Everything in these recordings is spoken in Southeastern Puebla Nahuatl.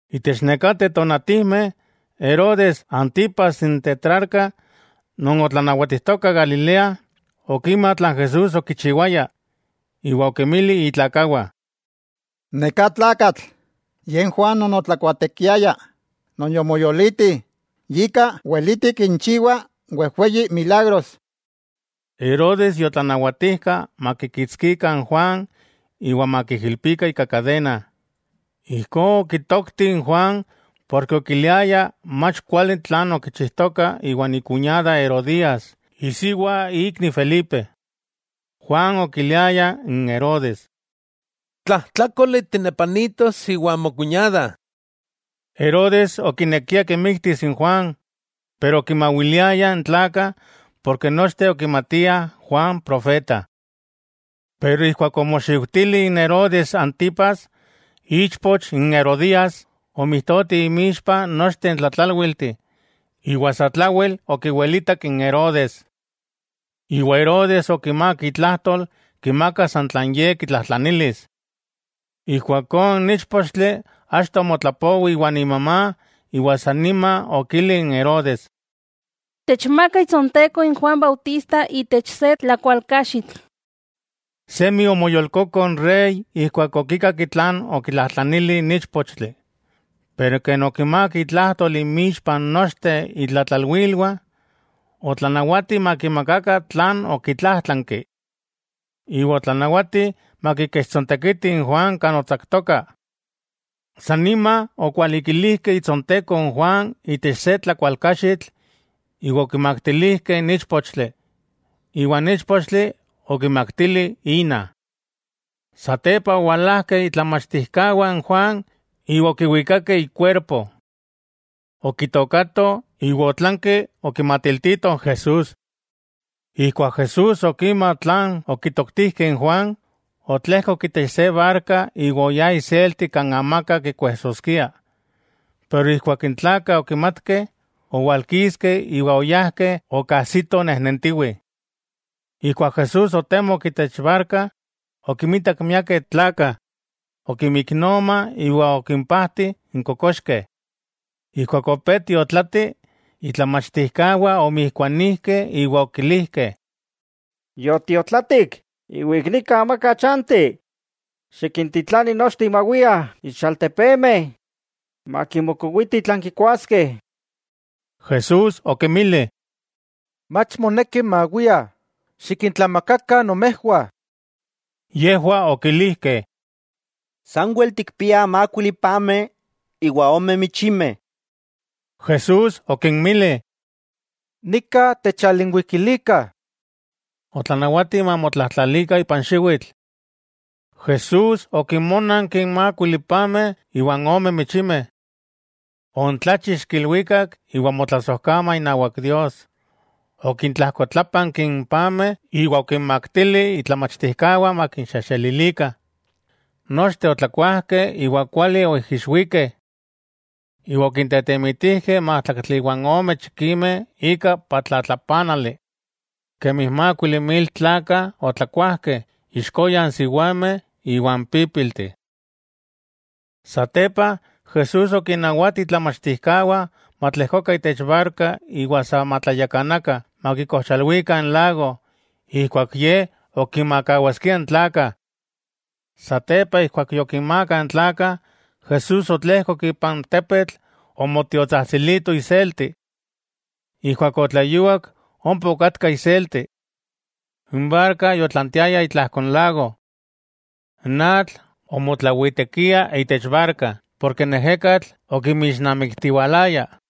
Itech nekateh tonatijmeh Herodes Antipas n Tetrarca non otlanawatijtoka Galilea, okima tlan Jesús okichiwaya, iwa okinmili itlakawah: —Neká tlakatl, ye n Juan non otlakuaatekiaya, non yomoyoliti, yika weleti kinchiwa wejweyi milagros. Herodes yotlanawatijka makikitskikah n Juan iwa makiijilpikah ika kadena. Ijkó okitokti n Juan porke okiliaya mach kuali tlan okichijtoka iwan ikuñada Herodías, isiwa ikni Felipe. Juan okiliaya n Herodes: —Tlajtlákoli tinepanitos iwan mokuñada. Herodes okinekia kimiktis n Juan, pero okinmawiliaya n tlakah porke nochteh okimatiah Juan profeta. Pero ijkuak omoxiujtili Herodes Antipas, ichpoch n Herodías, omijtoti inmixpa nochteh n tlatlálwilteh, iwa satlawel okiwelitak n Herodes. Ompa Herodes okimák itlajtol, kimakas san tlan ye kitlajtlanilis. Ijkuakó n íchpochtli achto omotlapowi iwan imamá iwa sanima okili n Herodes: —Techmaka itsonteko n Juan Bautista itech se tlakualkaxitl. Semi omoyolkoko n rey ijkuak okikak tlan okitlajtlanili n íchpochtli. Pero ken okimák itlajtol inmixpa nochteh itlatlalwilwah, otlanawati makimakakah tlan okitlájtlanki. Iwa otlanawati makikechtsontekitih n Juan kan otsaktoka, sanima okualikilijkeh itsonteko n Juan itech se tlakualkaxitl iwa okimaktilijkeh n íchpochtli, iwa n íchpochtli okimaktili ina. Satepa owalajkeh itlamachtijkawah n Juan iwa okiwikakeh ikuerpo. Okitookatoh, iwa otlanki okimatiltitoh n Jesús. Ijkuak Jesús okima tlan okitoktijkeh n Juan, otlejkok itech se barka iwa oyá iselti kan amaka kikuejsoskia. Pero ijkuak n tlakah okimatkeh, owalkiskeh iwa oyajkeh okajsitoh nejnentiwih. Ijkuak Jesús otemok itech barka, okinmitak miakeh tlakah, okimiknoma iwa okimpajti n kokoxkeh. Ijkuak opé tiotlati, itlamachtijkawah omijkuanijkeh iwa okilijkeh: —Yotiotlatik, iwa ik nika amaka chanti. Xikintitlani nochteh mawiah itech altepemeh, makimokowitih tlan kikuaskeh. Jesús okinmili: —Mach moneki mawiah, xikintlamakakah nomejwah. Yejwah okilijkeh: —Sanwel tikpiah mákuili pameh iwa ome michimeh. Jesús okinmili: —Nika techalinwikilikah. Otlanawati mamotlajtlalikah ipan xiwitl. Jesús okinmónanki n mákuili pameh iwa n ome michimeh. Ontlachixki ilwikak iwa omotlasojkama inawak Dios, okintlajkotlápanki n pameh iwa okinmaktili itlamachtijkawah makinxejxelilikah. Nochteh otlakuajkeh iwa kuali oijixwikeh. Iwa okintetemitijkeh májtlaktli iwa ome chikimeh ika patlatlapanali. Kemi mákuili mil tlakah otlakuajkeh, ixkoya n siwameh iwa n pípilteh. Satepa, Jesús okinnawati itlamachtijkawah matlejkokah itech barka iwa sa matlayakanakah makikojchalwikah n lago, ijkuak Ye ok kinmakawaskia n tlakah. Satepa, ijkuak yokinmaakah n tlakah, Jesús otlejkok ipan tepetl omotiotsajtsilito iselti. Ijkuak otleyuak ompa okatka iselti. N barka yotlantiaya itlajko n lago. N atl omotlawitekia itech barka porke n ejekatl okimixnamiktiwalaya.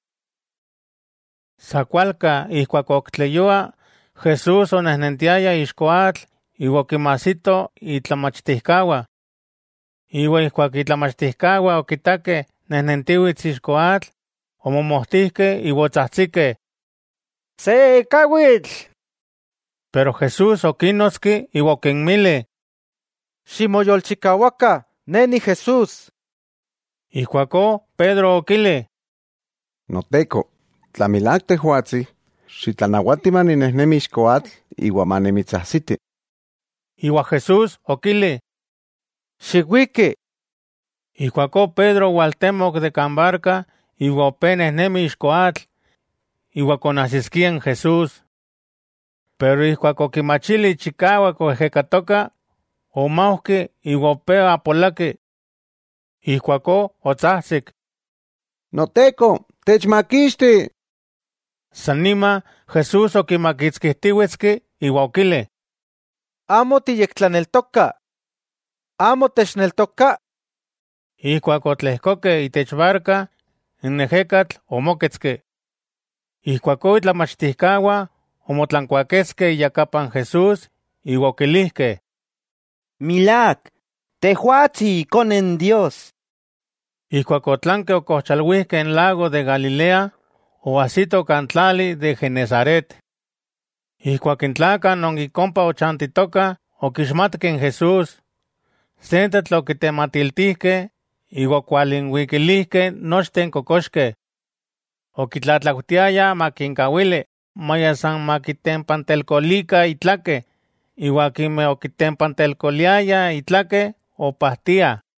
Sa kualka ijkuak ok tleyua, Jesús onejnentiaya ixko atl iwa okinmajsito itlamachtijkawah. Iwa ijkuak itlamachtijkawah okitakeh nejnentiwits ixko atl, omomojtijkeh iwa otsajtsikeh: —¡Se ekawitl! Pero Jesús okínnotski iwa okinmili: —¡Ximoyolchikawakah, Ne Ni Jesús! Ijkuakó Pedro okili: —Noteko, tla milák Tejwatsi, xitlanawati maninejnemi ixko atl iwa manimitsajsiti. Iwa Jesús okili: —Xiwiki. Ijkuakó Pedro owaltemok de kan barka iwa opé nejnemi ixko atl, iwa konajsiskia n Jesús. Pero ijkuak okimachili chikawak oejekatoka, omaujki iwa opé apolaki. Ijkuakó otsajtsik: —¡Noteko, techmakixti! Sannima Jesús okimakitskijtiwetski iwa okili: —¡Amo tiyektlaneltoka!, ¿amo techneltoka? Ijkuak otlejkokeh itech barka, n ejekatl omóketski. Ijkuakó, itlamachtijkawah omotlankuaketskeh iyakapa n Jesús iwa okilijkeh: —Milák, Tejwatsi Ikone Dios. Ijkuak otlankeh okojchalwijkeh n lago de Galilea, oajsito kan tlali de Genesaret. Ijkuak n tlakah non ik ompa ochantitokah okixmatkeh n Jesús, sentetl okitematiltijkeh iwa okwalinwikilijkeh nochteh n kokoxkeh. Okitlatlaujtiayah makinkawili maya san makitempantelkolikah itlakeh, iwa akimeh okitempantelkoayah itlakeh opajtiah.